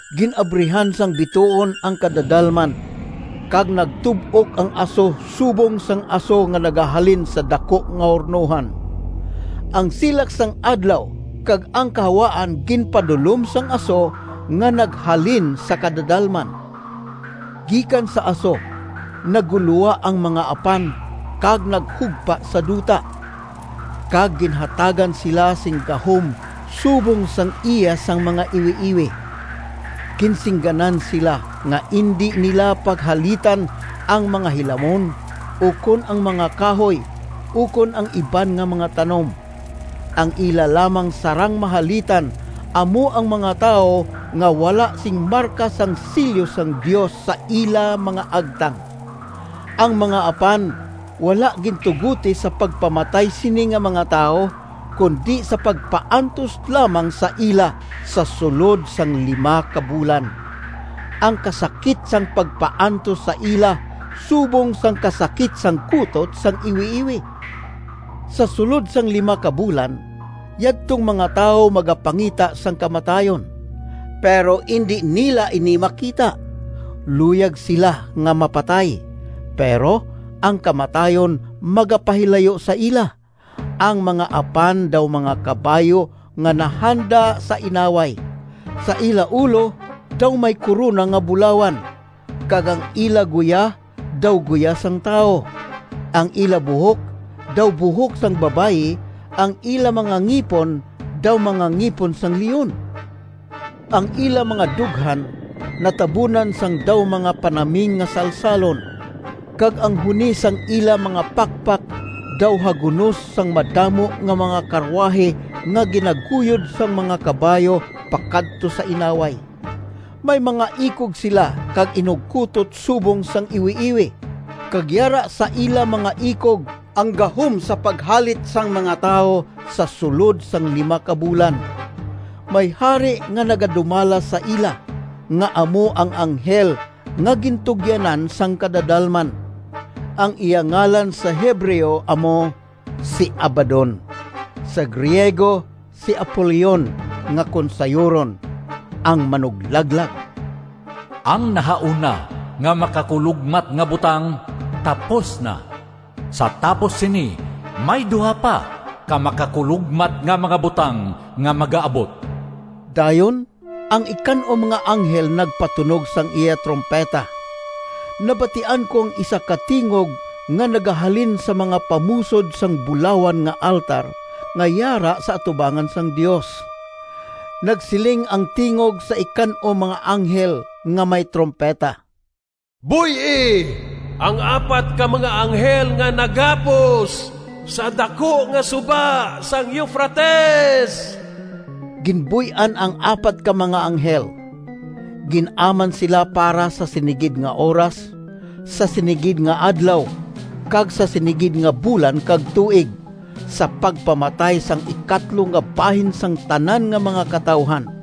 Gin-abrihan sang bituon ang kadadalman, kag nagtub-ok ang aso subong sang aso nga nagahalin sa daku nga hurnohan. Ang silak sang adlaw kag ang kahawaan ginpadulom sang aso nga naghalin sa kadadalman. Gikan sa aso naggulowa ang mga apan kag naghugpa sa duta, kag ginhatagan sila sing gahom subong sang iya sang mga iwiiwi. Ginsingganan sila nga indi nila paghalitan ang mga hilamon, ukon ang mga kahoy, ukon ang iban nga mga tanom. Ang ila lamang sarang mahalitan amo ang mga tawo nga wala sing marka sang selyo sang Dios sa ila mga agtang. Ang mga apan wala gintugoti sa pagpamatay sini nga mga tawo, kundi sa pagpaantos lamang sa ila sa sulod sang lima ka bulan. Ang kasakit sang pagpaantos sa ila subong sang kasakit sang kutot sang iwiiwi. Sa sulod sang lima ka bulan, yadtong mga tawo magapangita sang kamatayon, pero indi nila ini makita. Luyag sila nga mapatay, pero ang kamatayon magapahilayo sa ila. Ang mga apan daw mga kabayo nga nahanda sa inaway. Sa ila ulo daw may korona nga bulawan, kag ang ila guya daw guya sang tawo. Ang ila buhok daw buhok sang babayi, ang ila mga ngipon daw mga ngipon sang leon. Ang ila mga dughan natabunan sang daw mga panaming nga salsalon, kag ang huni sang ila mga pakpak daw hagunos sang madamo nga mga karuwahi nga ginaguyod sang mga kabayo pakadto sa inaway. May mga ikog sila kag inugkutot subong sang iwiiwi, kag yara sa ila mga ikog ang gahom sa paghalit sang mga tawo sa sulod sang lima ka bulan. May hari nga nagadumala sa ila, nga amo ang anghel nga gintugyanan sang kadadalman. Ang iya ngalan sa Hebreo amo si Abaddon, sa Griego si Apolion nga kon sayuron, “Ang Manuglaglag”. Ang nahauna nga makakulogmat nga butang tapos na. Sa tapos sini may duha pa ka makakulogmat nga mga butang nga magaabot. Dayon ang ikan-om nga anghel nagpatunog sang iya trumpeta. Nabatian ko ang isa ka tingog nga nagahalin sa mga pamusod sang bulawan nga altar nga yara sa atubangan sang Dios. Nagsiling ang tingog sa ikan-om nga anghel nga may trumpeta, “Buy-i ang apat ka mga anghel nga nagapos sa daku nga suba sang Eufrates!” Ginbuy-an ang apat ka mga anghel. Gin-aman sila para sa sini gid nga oras, sa sini gid nga adlaw kag sa sini gid nga bulan kag tuig, sa pagpamatay sang ikatlo nga bahin sang tanan nga mga katawuhan.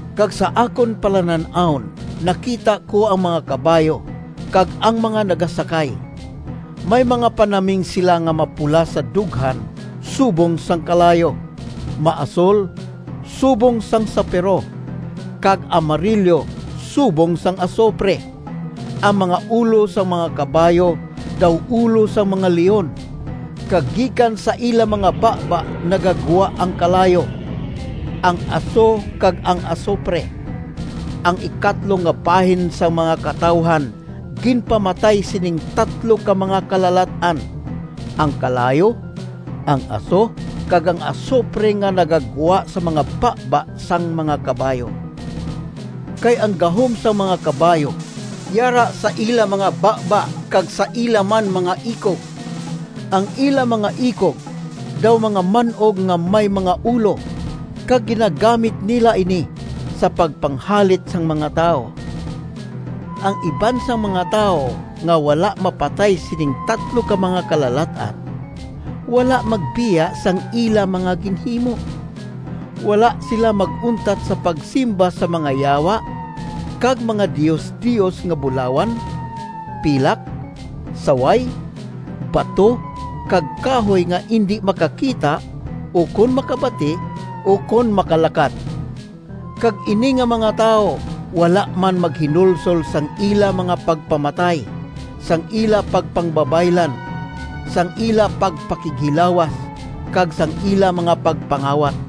Kag sa akon palanan-awon nakita ko ang mga kabayo kag ang mga nagasakay. May mga panaming sila nga mapula sa dughan subong sang kalayo, maasol subong sang sapiro, kag amarilyo subong sang asupre. Ang mga ulo sang mga kabayo daw ulo sang mga leon, kag gikan sa ila mga baba nagagwa ang kalayo, ang aso kag ang asupre. Ang ikatlo nga bahin sang mga katawuhan ginpamatay sining tatlo ka mga kalalat-an: ang kalayo, ang aso, kag ang asupre nga nagagwa sa mga baba sang mga kabayo. Kay ang gahom sang mga kabayo yara sa ila mga baba kag sa ila man mga ikog. Ang ila mga ikog daw mga man-og nga may mga ulo, kag ginagamit nila ini sa pagpanghalit sang mga tawo. Ang iban sang mga tawo nga wala mapatay sining tatlo ka mga kalalat-an, wala magbiya sang ila mga ginhimo. Wala sila mag-untat sa pagsimba sa mga yawa kag mga diosdios nga bulawan, pilak, saway, bato, kag kahoy nga indi makakita, ukon makabati ukon makalakat. Kag ini nga mga tawo wala man maghinulsol sang ila mga pagpamatay, sang ila pagpangbabaylan, sang ila pagpakighilawas, kag sang ila mga pagpangawat.